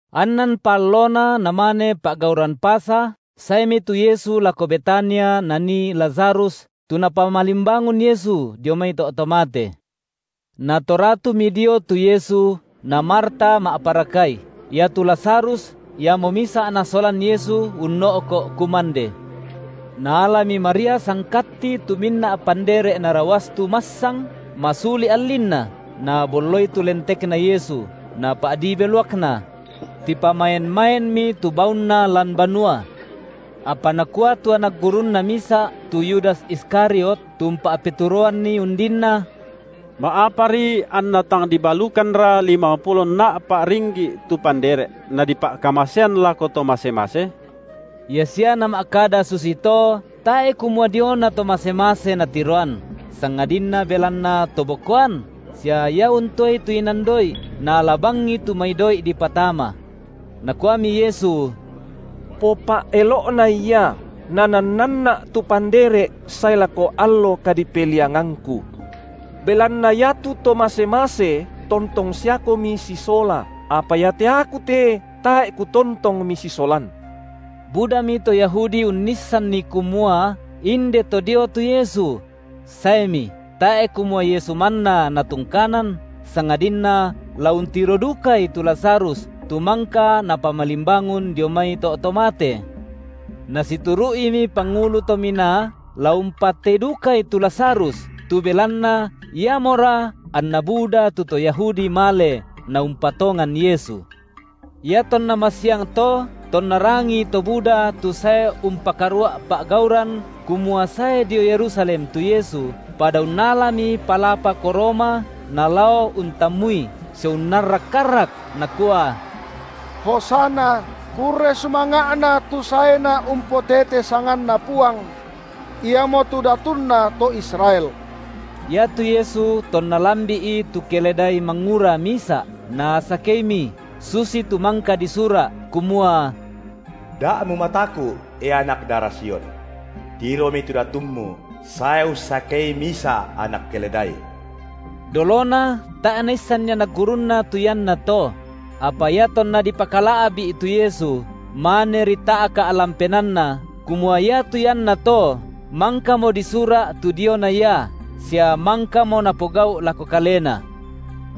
Annanpa allona namane pa’gauran Pasa, saemi tu Yesu lako Betania nanii Lazarus, tu Napamalimbangun Yesu dio mai to’ to mate. Natoratumi dio tu Yesu, na Marta ma’parakai; iatu Lazarus iamo misa’ Nasolan Yesu unno’ko’ kumande. Naalami Maria sangkatti tu minna’ pandere’ narawastu massang, masuli’ allinna, nabolloi tu lentekna Yesu, napa’dii beluakna. Tipamaen-maenmi tu baunna lan banua. Apa nakua tu anak gurunNa misa’, tu Yudas Iskariot, tu umpa’peturoanNi undinna: Ma’apari anna tang dibalukanra limangpulo nna’pa’ ringgi’ tu pandere’, nadipa’kamasean lako to mase-mase? Ia sia nama’kada susito, tae’ kumua diona to mase-mase natiroan, sangadinna belanna to bokoan, sia ia untoei tu inan doi’, naala bangi tu mai doi’ dipatama. Nakuami Yesu: Popa’elo’nai ia, nanannanNa’ tu pandere’ sae lako allo kadipeliangangKu. Belanna iatu to mase-mase tontong siakomi sisola, apa iate Aku te tae’ Kutontong misisolan. Budami to Yahudi unnissanni kumua inde to dio tu Yesu; saemi, tae’ kumua Yesu manna natungkanan, sangadinna la untiro dukai tu Lazarus, tu mangka Napamalimbangun dio mai to’ to mate. Nasituru’imi pangulu to minaa, la umpatei dukai tu Lazarus, tu belanna iamora anna buda tu to Yahudi male, naumpatongan Yesu. Iatonna masiang to tonna rangii to buda tu sae umpakarua’ pa’gauran kumua sae dio Yerusalem tu Yesu, pada unnalami palapa koroma nalao untammui sia unnarrak-arrak nakua: Hosana, kurre sumanga’Na tu saeNa umpotete sanganNa Puang. Iamotu datunna to Israel! Iatu Yesu tonna lambi’i tu keledai mangura misa’, Nasakeimi, susitu mangka disura’, kumua: Da mumataku’, e anak dara Sion. Tiromi tu Datummu sae ussakei misa’ anak keledai! Dolona tae’ naissanni anak gurunNa tu iannato; apa iatonna dipakala’bi’ tu Yesu, maneri ta’ka’ lan penaanna kumua iatu ianna to mangkamo disura’ tu diona Ia, sia mangkamo napogau’ lako Kalena.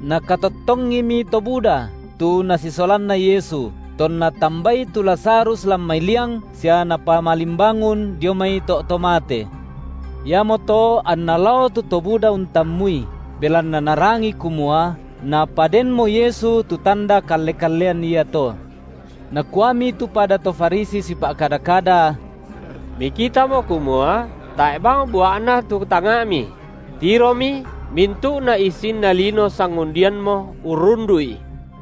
Nakatottongimi to buda, tu nasisolanna Yesu, tonna tambai tu Lazarus lan mai liang sia Napamalimbangun dio mai to’ to mate. Iamoto anna lao tu to buda untammui, belanna narangi kumua Napadenmo Yesu tu tanda kalle-kallean iato. Nakuami tu pada to Farisi sipa’- kada-kada: Mikitamo kumua tae’ bang bua’na tu tangnga’mi; tiromi mintu’na issinna lino sangundiammo urrundu’I.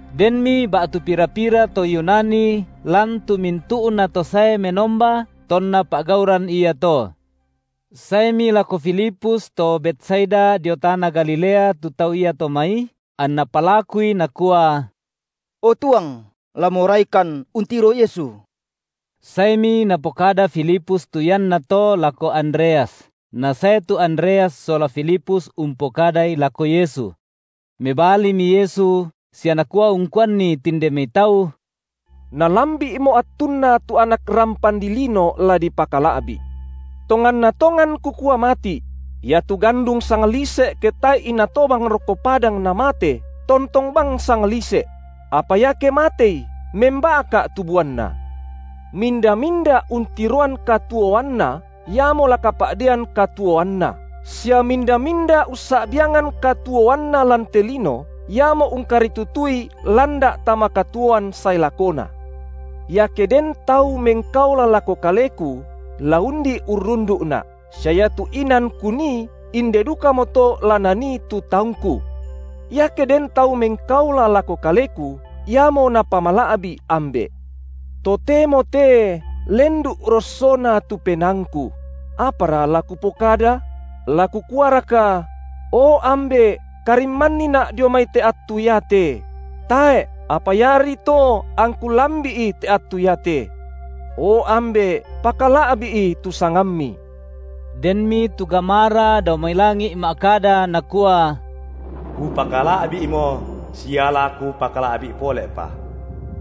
Denmi ba’tu pira-pira to Yunani lan tu mintu’nato sae menomba tonna pa’gauran iato. Saemi lako Filipus to Betsaida dio tana Galilea tu tau iato mai, anna palakui nakua: O tuang, la moraikan untiro Yesu. Saemi napokada Filipus tu iannato lako Andreas, nasae tu Andreas sola Filipus umpokadai lako Yesu. Mebalimi Yesu sia Nakua ungkuanni tinde mai tau: Nalambi’mo attunna tu Anak rampan dilino la dipakala’bi’. Tonganna tongan Kukua mati’: Iatu gandung sanglise’ ke tae’i natobang rokko padang namate, tontong bang sanglise’; apa iake matei, memba’ka’ tu buanna. Minda-minda untiroan katuoanna, iamo la kapa’dean katuoanna, sia minda-minda ussa’biangan katuoanna lan te lino, iamo ungkaritutui landa’ tama katuoan sae lakona. Iake den tau mengkaola lako Kaleku, la undi urrundu’Na’, sia iatu inan Kunii, inde dukamoto la nanii tu taungKu. Iake den tau mengkaola lako Kaleku, iamo Napamala’bi’ Ambe’. Totemo te lendu’ rossona tu penaangKu; apara la Kupokada? la Kukuaraka: O Ambe’, karimmanniNa’ dio mai te attu iate! Tae’, apa iari to angKu lambi’i te attu iate. O Ambe’, pakala’bi’i tu sangamMi! Denmi tu gamara dao mai langi’ ma’kada nakua: Kupakala’bi’mo sia la Kupakala’bi’ pole’pa.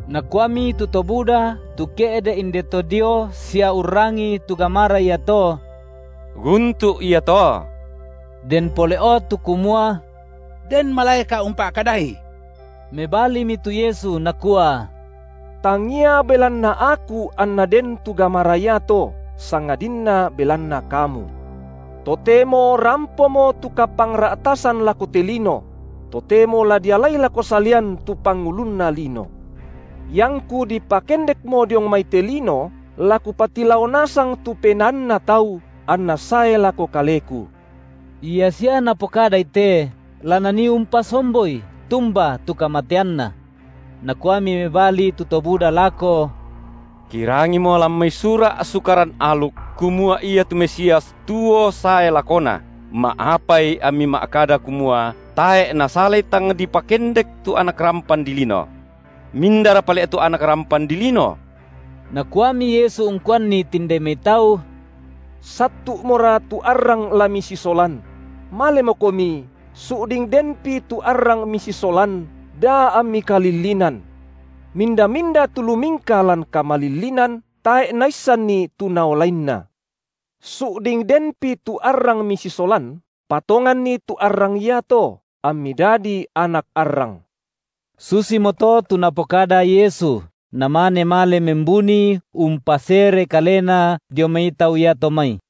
Nakuami tu to buda, tu ke’de’ inde to dio sia urrangii tu gamara iato: Guntu’ ia to; den pole’o tu kumua: Den malaeka’ umpa’kadaI. Mebalimi tu Yesu Nakua: Tangia belanna Aku anna den tu gamara iato, sangadinna belanna kamu. Totemo rampomo tu kapangra’tasan lako te lino; totemo la dialai lako salian tu pangulunna lino. IangKu dipakendekmo diong mai te lino, la Kupatilao nasang tu penaanna tau, anna sae lako Kaleku. Ia sia Napokadai te, la Nanii umpasomboi tumba tu kamateanNa. Nakuami mebali tu to buda lako: Kirangimo lan mai sura’ Sukaran aluk, kumua iatu Mesias tuo sae lakona, ma’apai amMi ma’kada kumua tae’ nasalai tang dipakendek tu Anak rampan dilino. Mindara pale’ tu Anak rampan dilino? Nakuami Yesu ungkuanni tinde mai tau: Sattu’mora tu arrang la misisolan; malemokomi su’ding denpi tu arrang misisolan da ammi kalillinan. Minda-minda tu lumingka lan kamalillinan, tae’ naissanni tu naolainna. Su’ding denpi tu arrang misisolan, patonganni tu arrang iato, ammi dadi anak arrang. Susimoto tu Napokada Yesu, namane male membuni umpasere Kalena dio mai tau iato mai.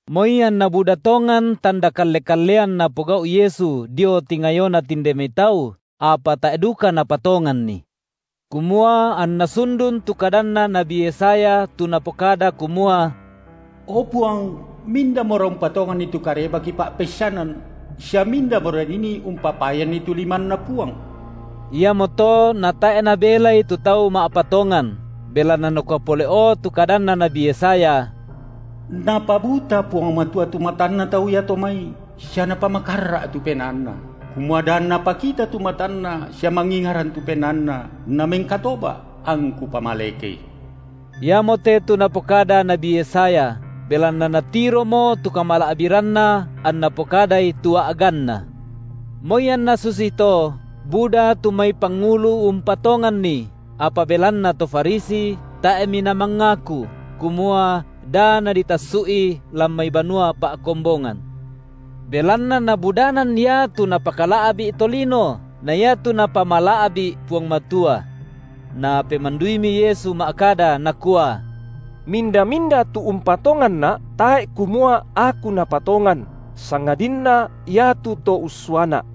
Moi anna buda tongan tanda kalle-kallean Napogau’ Yesu dio tingayona tinde mai tau, apa tae’ duka napatonganNi, kumua anna sundun tu kadanna nabi Yesaya tu napokada kumua: O Puang mindamora umpatonganni tu kareba kipa’peissanan? sia mindamora dinii umpapayanni tu limanNa Puang? Iamoto natae’ nabelai tu tau ma’patongan, belanna nakua pole’o tu kadanna nabi Yesaya: Napabuta Puang Matua tu matanna tau iato mai sia Napamakarra’ tu penaanna, kumua da anna pakita tu matanna sia mangingaran tu penaanna namengkatoba’, angKu pamalekei. Iamote tu napokada nabi Yesaya, belanna natiromo tu kamala’biranNa anna pokadai tu a’ganNa. Moi anna susito, buda tu mai pangulu umpatonganNi, apa belanna to Farisi, tae’mi namangaku, kumua da naditassu’i lan mai banua pa’kombongan. Belanna nabudanan iatu napakala’bi’ tolino na iatu Napamala’bi’ Puang Matua. Napemanduimi Yesu ma’kada Nakua: Minda-minda tu umpatonganNa’, tae’ kumua Aku napatongan, sangadinna iatu To ussuaNa’;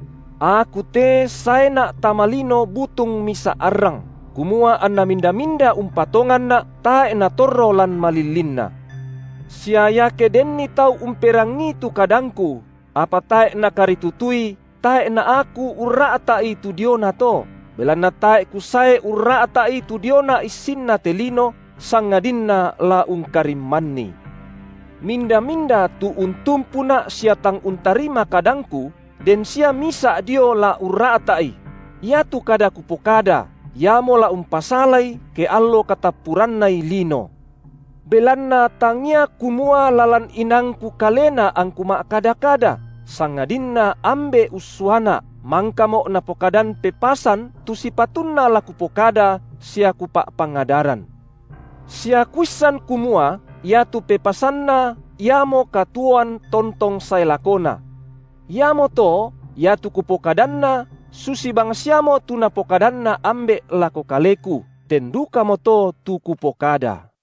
Aku te saeNa’ tama lino butung misa’ arrang, kumua anna minda-minda umpatonganNa’ tae’ natorro lan malillinna. Sia iake denni tau umperangii tu KadangKu, apa tae’ nakaritutui, tae’ na Aku urra’ta’i tu diona to, belanna tae’ Kusae urra’ta’i tu diona issinna te lino, sangadinna la ungkarimmanni. Minda-minda tu untumpuNa’ sia tang untarima kadangKu, den sia Misa’ dio la urra’ta’i: iatu kada Kupokada, iamo la umpasalai ke allo katappurannai lino. Belanna tangia kumua lalan inaangKu kalena angKu ma’kada-kada, sangadinna Ambe’ ussuaNa’, mangkaMo’ Napokadan pepasan tu sipatunna la Kupokada sia Kupa’pangadaran. Sia Kuissan kumua iatu pepasanNa iamo katuoan tontong sae lakona. Iamoto iatu Kupokadanna, susi bangsiamo tu Napokadanna Ambe’ lako kaleku, ten dukamoto tu Kupokada.